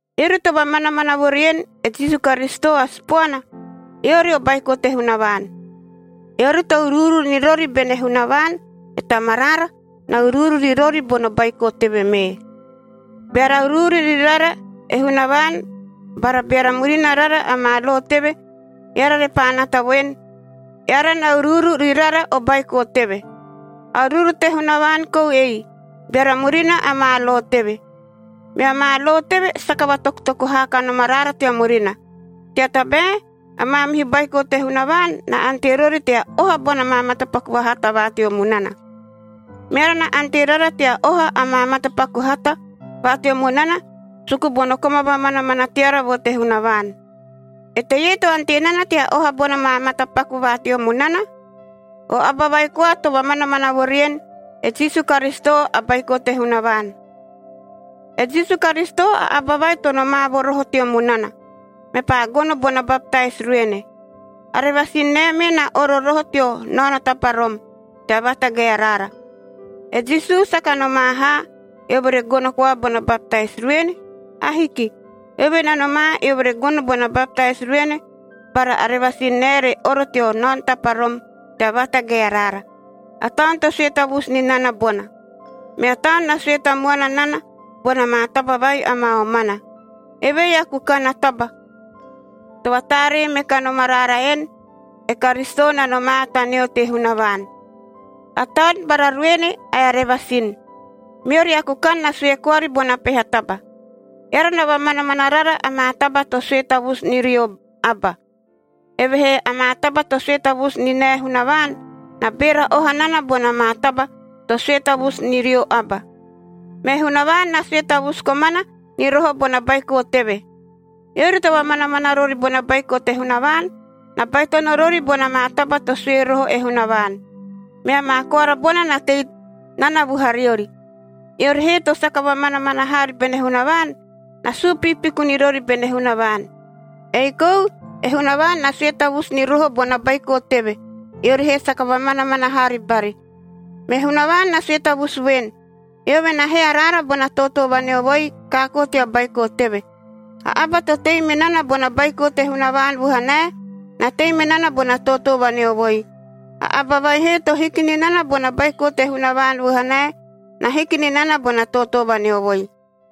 Eori to vamanamana vo rien, e Jisu Karisito a Sipoana, eori o baiko te Hunavaan. Eori to uruuru ni rori bene Hunavaan e Tamaraara, na uruuru ri rori bono baiko teve mee. Beara uruuru ni rara e Hunavaan bara beara murina rara amaa lo teve, eara repaa nata voen, eara na uruuru ri rara o baiko teve. A uruuru te Hunavaan kou ei, beara murina amaa lo teve. Mea maa lo teve saka vatokutoku haa kanom araara tea murina, tea tabae a maamihu baiko te Hunavaan na ante rori tea oha bona maa matapaku vahata va teo munana. Meara na ante rara tea oha amaa matapaku hata va teo munana, suku bono koma vamanamana teara vo te Hunavaan. Eteie to ante nana tea oha bona maa matapaku va teo munana? O aba vai koa to vamanamana vo rien, e Jisu Karisito a Baiko te Hunavaan. E Jisu Karisito a aba vai to nomaa vo roho teo munana. Mepaa gono bona baptais ruene. A revasin nae mee na oro roho teo naono taparom tea vaatagae araara. E Jisu saka nomaa haa, eove re gono koa bona baptais ruene. Ahiki. Eove na nomaa eove re gono bona baptais ruene bara a revasin nae re oro teo naono taparom tea vaatagae araara. A Taun to sue tavusu ni nana bona. Mea Taun na sue tamuana nana bona maa taba vai amaa omana. Evei a kukan a taba to vataaree me kanom araara en, e Karisito na nomaa taneo te Hunavaan: A Taun bara ruene ae a revasin. Meori a kukan na sue koari bona peha taba. Eara na vamanamana rara amaa taba to sue tavusu ni rio aba. Evehee amaa taba to sue tavusu ni nae Hunavaan, na beera oha nana bona maa taba to sue tavusu ni rio aba. Me Hunavaan na sue tavusu komana ni roho bona Baiko teve. Eori to vamanamana rori bona Baiko te Hunavaan, na baitono rori bona maa taba to sue roho e Hunavaan. Mea maa koara bona na tei nana vuhariori. Eori he to saka vamanamana haari bene Hunavaan, na suu piipiku ni rori bene Hunavaan. Ei kou e Hunavaan na sue tavusu ni roho bona Baiko teve, eori he saka vamanamana haari bari. Me Hunavaan na sue tavusu voen, eove na hee araara bona tootoo vaneovoi kaakoo tea Baiko teve. A aba to tei me nana bona Baiko te Hunavaan vuhanae, na tei me nana bona tootoo vaneovoi. A aba vai he to hiki ni nana bona Baiko te Hunavaan vuhanae, na hiki ni nana bona tootoo vaneovoi.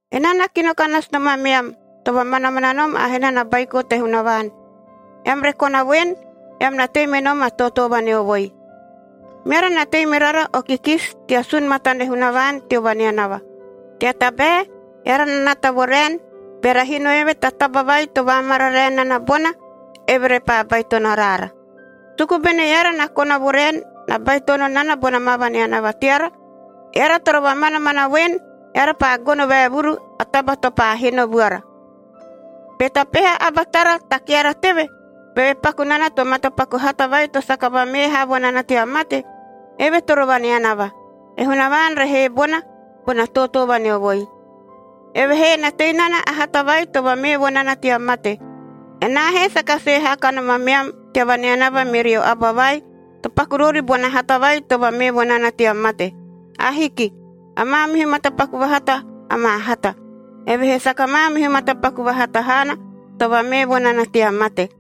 Enaa na kino ka nasu nom ameam, to vamanamana nom a hena na Baiko te Hunavaan, eam re kona voen, eam na tei me nom a tootoo vaneovoi. Meara na tei me rara o kikisi tea sun matane Hunavaan teo vaneanava. Tea tabae eara na nata vo raen, beara hino eve ta taba vai to vaamararae nana bona, eve repaa baitono araara. Suku bene eara na kona vo raen, na baitono nana bona maa vaneanava teara, eara toro vamanamana voen, eara paa gono vaevuru a taba to paa hino vuara. Be ta peha aba tara ta keara teve, beve paku nana to matapaku hata vai to saka vamee haa vo nana tea mate, eve toro vaneanava, e Hunavaan re hee bona, bona tootoo vaneovoi. Evehee na tei nana a hata vai to vamee vo nana tea mate. Enaa he saka sue haa kanom ameam tea vaneanava merio aba vai to paku rori bona hata vai to vamee vo nana tea mate. Ahiki. A maamihu matapaku vahata amaa hata, evehee saka maamihu matapaku vahata haana to vamee vo nana tea mate.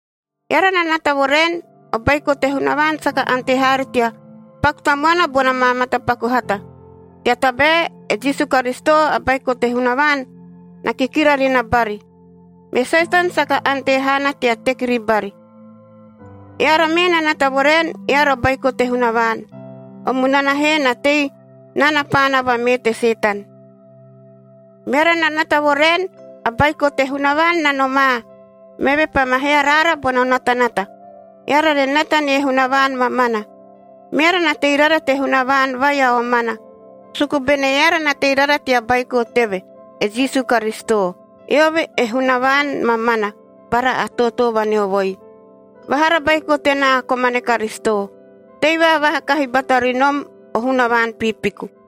Eara na nata vo raen, o baiko te Hunavaan saka ante haari tea paku tamuana bona maa matapaku hata, tea tabae e Jisu Karisito, a Baiko te Hunavaan, na kikira ri na bari. Me Setan saka ante haana tea teki ribari. Eara mee na nata vo raen, eara o baiko te Hunavaan. O munana he na tei nana paana vamee te Setan. Meara na nata vo raen a Baiko te Hunavaan na nomaa, meve paa ma hee araara bono natanata, eara re nata nie Hunavaan mamana. Meara na tei rara te Hunavaan vai a omana, suku bene eara na tei rara tea Baiko teve, e Jisu Karisito. Eove e Hunavaan mamana bara a tootoo vaneovoi. Vahara baiko tenaa komane Karisito, tei vaavaha kahi bata ri nom o hunavaan piipiku.